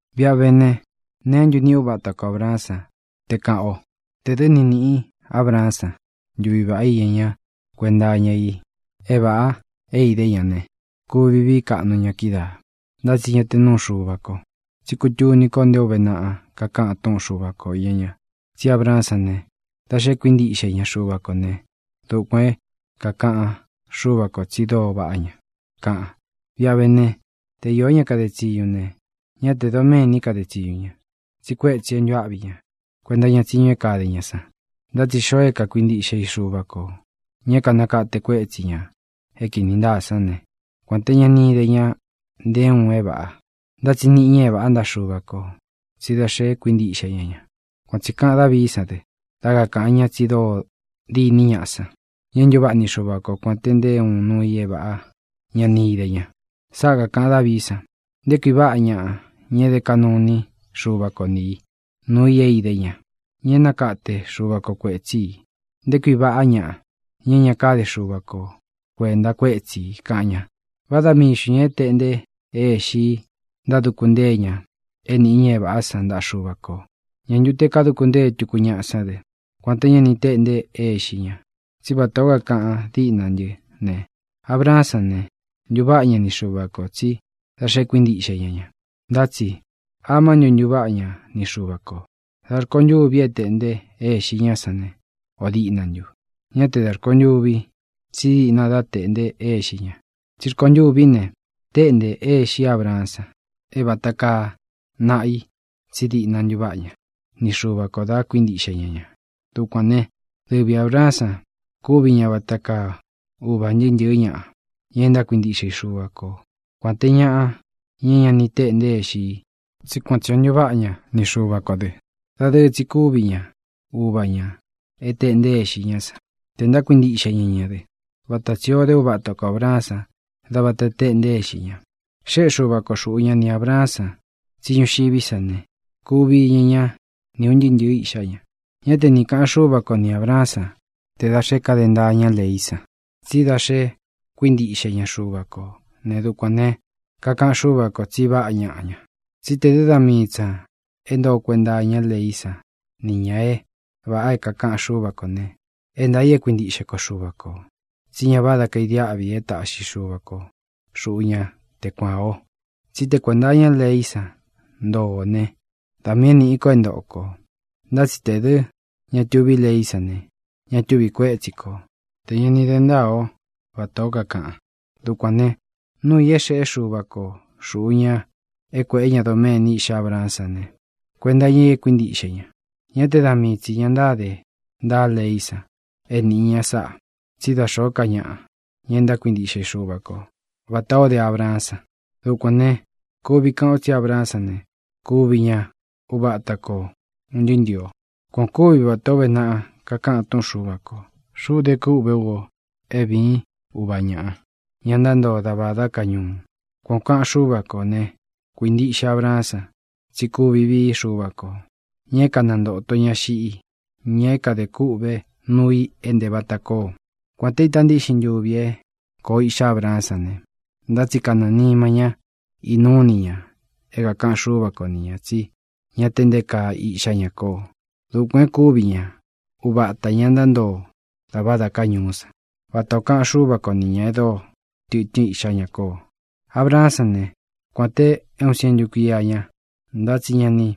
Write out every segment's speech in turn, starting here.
Viꞌa vé ne, ¿neé ntu niꞌi uva ata ko Ābraán san, te kāꞌan o? Tē dɨ́ ni nīꞌi Abraán san ntuvi vāꞌá iña ña kuenta iña i é vāꞌa é idé ña ne, kuvi víi kaꞌnu ña kídaā, ntá tsi ña te núu Xuva ko. Tsí kutuni ko nté o ūve naꞌa kakaꞌan túꞌun Xuva ko īña ña: “Tsí Abraán sán ne, da xe kuíntiꞌxe ña Xuva kō né, dukuān é kākaꞌan Xúva kō tsi dóo vaꞌá ña”, kaꞌan. Viꞌa vé ne, te iō ñá kade tsiñu ne, ñá tē doméni káde tsiñu ña, tsi kuétsī é ntuáꞌvi ña kuenta iña tsiñu é kade ña san. Ntá tsi xoo é kakuintiꞌxe i Xuva kō, ña é kānakate kuétsī ña é kīni ntáa sán ne, kuān té ña ni ide ña nté uun é vāꞌa, ntá tsi niꞌi ña é vāꞌá ntaꞌa Xuva kō tsí da xe kuíntiꞌxe ña ña. Kuan tsī kaꞌan Dávií san dɨ, dá kakāꞌan ña tsi dóo diní ñaꞌa san, ña é ntuváꞌa ni Xuva ko, kuān te nté uun nuu i é vāꞌa ña ni íde ña. Sáꞌa kākaꞌan Dávií san: Nté kui váꞌa ñaꞌa, ña e dé kaꞌnu iní Xuva ko ni ī nuu i é idé ña, ña é nakate Xuva ko kuētsí i. Nté kui váꞌa ñaꞌa, ña é ña kade Xuva ko kuēnta kuétsi ī, kaꞌan ña. ¿Vá da mii xntū ña é tēꞌnte é ixi í ntáduku ntée ña é nīꞌi ña é vāꞌá san ntaꞌa Xuva kō? ¿Ñā ntu te kaduku ntée tuku ñaꞌa sán dɨ, kuān té ña ni teꞌnte é ixi ña? Tsí vatā ó kakaꞌan díꞌna ntɨ́ ne, Abraán sán ne, ntuváꞌa ña ni Xuva kō tsí da xe kuíntiꞌxe ñá ña. Ntá tsi, ¿amá ntu ntuváꞌa ña ni Xuva kō? ¿Dā rkontûví e téꞌnte é ixi ñá san ne, o dīꞌna ntu? Ñá te dā rkontûvi, tsí diꞌna dā teꞌnte é ixi ña. Tsí rkontûví ne, tēꞌnte é ixí Abraán san é vata kaa naꞌa i tsí diꞌna ntuváꞌa ña ni Xuva kō da kuíntiꞌxe ña ña. Dukuān né, dɨvi Ābraán san kuvi ña vata kaa uva ūn ntɨɨ́ ntɨ̄ɨ́ ñaꞌa, ña é ntákuintiꞌxe i Xuva ko, kuān te ñaꞌa, ña é ña ni téꞌnte é ixi i, tsí kuan tsī o ntántuváꞌa ña ni Xuva kō dɨ. Dadɨɨ tsi kúvi ña ūvá ña é teꞌnte é ixi í san, tē ntákuintiꞌxe ñá ña dɨ́, vata tsī o dé uva ata ko Ābraán san dá vāta téꞌnte é ixi ña. Xéꞌe Xuva ko xuꞌu ña ni Ābraán san tsí ñuxiví sa ne, kuvi iña ñá ni ūn ntɨɨ́ ntɨ̄ɨ́ iꞌxá ña. Ñá te ni kāꞌan Xúva ko ni Ābraán san te dā xé kade ntaa ñá leí san, tsí da xe kuíntiꞌxe ña Xuva kō né, dukuān ne, kakaꞌan Xúva kō tsi vaꞌá ñaꞌa ña. Tsí tē dɨ́ da mii tsī ña é ntoo kuenta iñá leí san niꞌi ña é vāꞌa é kākaꞌan Xúva kō ne, é ntaā i e kuíntiꞌxe ko Xuva kō, tsí ña váda kaidiáꞌvi é taꞌxi Xuva ko xuꞌu ña te kuan ō. Tsí te kuēnta iñá leí san ntoo ō ne, da miī é nīꞌi ko é ntoꞌo kō. Ntá tsi tē dɨ́ ña tuví leí san ne, ña túvi kuētsí ko tē ña ni de ntáa o vatā ó kakaꞌan. Dukuān ne, núu ī é xeꞌé Xuva ko xūꞌu ña é kuēꞌé ña doméni iꞌxá Abraán san ne, kuenta iña i é kuintíꞌxe ña. Ñá te da míi tsi ña ntáde ntaa leí san é nīꞌi ña sáꞌā, tsí da xōó ka ñaꞌa, ña e ntákuintiꞌxe i Xuva ko vatā o dé Abraán san. Dukuān ne, kuvi kaꞌan o tsí Abraan sán ne, kuvi ña uva ata ko ūn ntɨɨ́ ntɨ̄ɨ o. Kuan ō kúvi vatā ó uve naꞌa kakaꞌan túꞌun Xuva kō: “Xuꞌu dé kûꞌvé u o é vīín uva ñāꞌa, ña ntántoo da vādá ka ñuu.” Kuan ō kaꞌan Xúva ko ne, kuīntiꞌxe Abraán san tsí kuvi vií Xuva kō, ña é kanantōto ña xiꞌi, ña é kadē kûꞌvé nuu i é ntē vata koo. Kuān té ita ntíꞌxin ntuvi é kōo iꞌxá Abraán san ne, ntá tsi kanɨɨ̄ nima ñá inúu ini ña é kākaꞌan Xúva kō ni ñā tsí ña te nté kaa iꞌxá ña koo. Dukuān é kuvi ña uvatā ña ntántoo da vādá ka ñuú san, vata ō kaꞌan Xúva ko ni ñā e dóo tɨtɨ́n iꞌxá ña koo. Abraán san ne, kuān te é uun sientu kuía ña, ntá tsi ña ni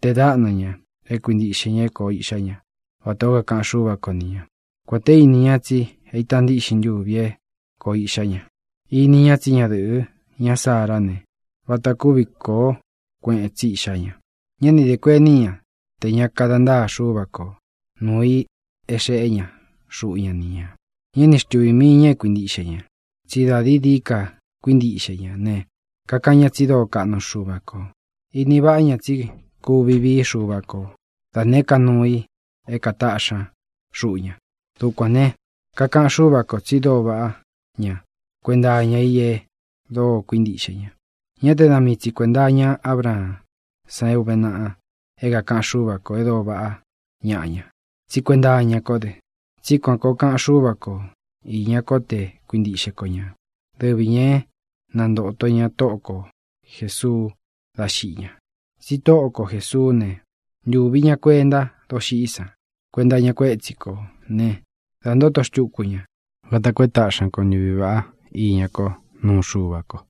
tee dáꞌna ña é kuintiꞌxe ña é kōo iꞌxá ña vatā ó kakaꞌan Xúva ko ni ña, kuān té ini ña tsi é ita ntíꞌxin ntuvi é kōo iꞌxá ña. Ini ña tsí ñadɨꞌɨ̄ ñá Sará ne, vata kúvi kōó kueꞌen tsi iꞌxá ña. Ñá ni dē kuení ña tē ña kada ntaa Xúva ko nuū i é xeꞌé ña xuꞌu ña ni ñā. Ñá ni xtuvī mii ña é kuintiꞌxe ña, tsí da dií dií ka kuíntiꞌxe ña ne, kakaꞌan ña tsi dóo kaꞌnu Xuva kō. Ini váꞌa ña tsí kuvi vií Xuva ko da nēé ka nuu i é kātaꞌxi ña xuꞌu ña. Dukuān ne, kakaꞌan Xúva kō tsi dóo vaꞌá ña kuenta iña i e dóo kuíntiꞌxe ña. Ñá te da mii tsi kuēnta iña Ábraán san é ūve naꞌa é kākaꞌan Xúva kō e dóo vaꞌá ñaꞌa ña, tsí kuenta iña kó dɨ. Tsí kuān koo kaꞌan Xúva ko īña kó te kuintiꞌxe ko ña, dɨvi ñā é nantōto ña Tóꞌo ko Jēsuu dá xiꞌi ña. Tsi Tóꞌo ko Jēsuú ne, ntūvi ña kuenta doxiꞌí san kuenta iña kuétsi kō né, dā ntóto xtuku ña vata koo é taꞌxi ña ko ntuvi vāꞌá iña kó nuu Xuva ko.